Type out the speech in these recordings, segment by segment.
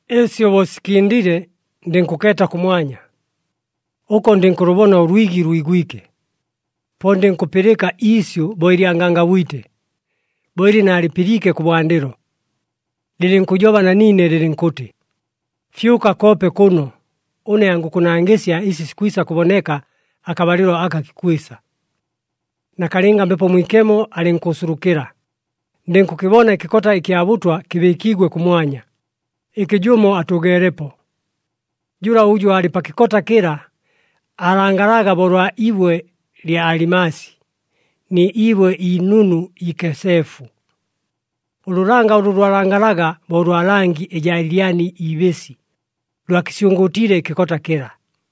Ɨsyo bo sikɨndile, ndɨnkʉkeeta kʉmwanya. Ʉko ndɨnkʉlʉbona ʉlwigi lwigwike. Po ndɨnkʉpɨlɨka iisyʉ bo ɨlya ngangabwite, bo ɨlɨ naalɨpɨliike kʉbwandɨlo, lɨlɨnkʉjoba na niine lɨlɨnkʉtɨ, “Fyʉka koope kʉno, ʉne angʉkʉnangɨsya ɨsi sikwisa kʉboneka akabalɨlo aka kikwisa.” Nakalɨnga, Mbepo Mwikemo alɨnkʉʉsulukɨla, ndɨnkʉkɨbona ɨkɨkota ɨkya bʉtwa kɨbɨɨkiigwe kʉmwanya, ɨkɨ jʉmo atʉʉgeelepo. Jʉla ʉjʉ aalɨ pa kɨkota kɨla, aalangalaga bo ʉlwa iibwe lya alimasi ni ibwe iinunu iikeseefu. Ʉlʉlanga ʉlʉ lwalangalaga bo ʉlwa langi ɨjaa lyani ibɨsi, lwakɨsyʉngʉʉtiile ɨkɨkota kɨla.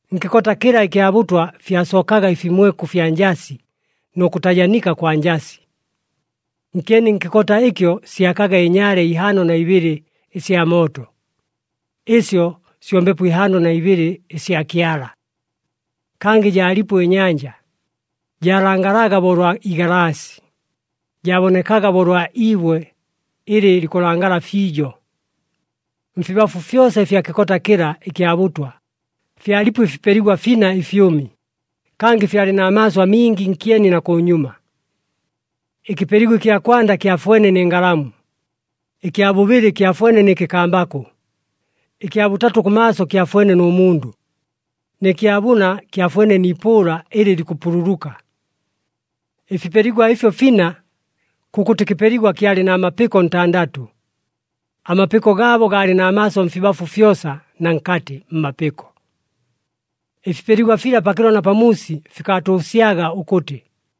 Nkɨkota kɨla ɨkya bʉtwa fyasookaga ɨfimweku fya njasi nʉ kʉtajanika kwa njasi. Nkyeni nkɨkota ɨkyo syakaga ɨnyaale ihaano na ibɨlɨ ɨsya mooto. Ɨsyo syo Mbepo ihaano na ibɨlɨ ɨsya Kyala. Kangɨ jaalipo ɨnyanja, jaalangalaga bo ʉlwa igalaasi, jaabonekaga bo ʉlwa iibwe ɨlɨ likʉlangala fiijo. Mfibafu fyosa ɨfya kɨkota kɨla ɨkya bʉtwa, fyalipo ɨfipeligwa fina ɨfyʉmi, kangɨ fyalɨ na maaso amingi nkyeni na kʉnyuma. Ɨkɨpeligwa ɨkya kwanda kyafwene nɨ ngalamu, ɨkya bʉbɨlɨ kyafwene nɨ kɨkambakʉ, ɨkya bʉtatʉ kʉmaaso kyafwene nʉ mundʉ, nɨ kya bʉna kyafwene ni ipʉʉla ɨlɨ likʉpululuka. Ɨfipeligwa ɨfyo fina, kʉkʉtɨ kɨpeligwa kyalɨ na mapɨko ntandatʉ, amapɨko gaabo gaalɨ na maaso mfibafu fyosa na nkatɨ mmapɨko. Ɨfipeligwa fila pakɨlo na pamuusi fikaatʉʉsyaga ʉkʉtɨ,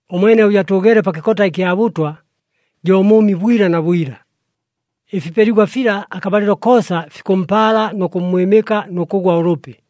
Ʉmwene ʉjʉ atʉʉgeele pa kɨkota ɨkya bʉtwa, jo mʉʉmi bwila na bwila. Ɨfipeligwa fila akabalɨlo koosa fikʉmpaala nʉ kʉmmwɨmɨka nʉ kʉgwa ʉlʉpi.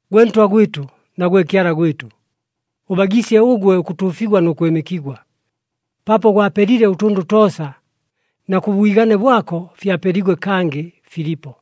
“Gwe Ntwa gwɨtʉ na gwe Kyala gwɨtʉ, ʉbagiisye ʉgwe, ʉkʉtuufigwa nʉ kwɨmɨkigwa, paapo gwapelile ʉtʉndʉ toosa, na kʉ bwigane bwako fyapeliigwe, kangɨ filipo.”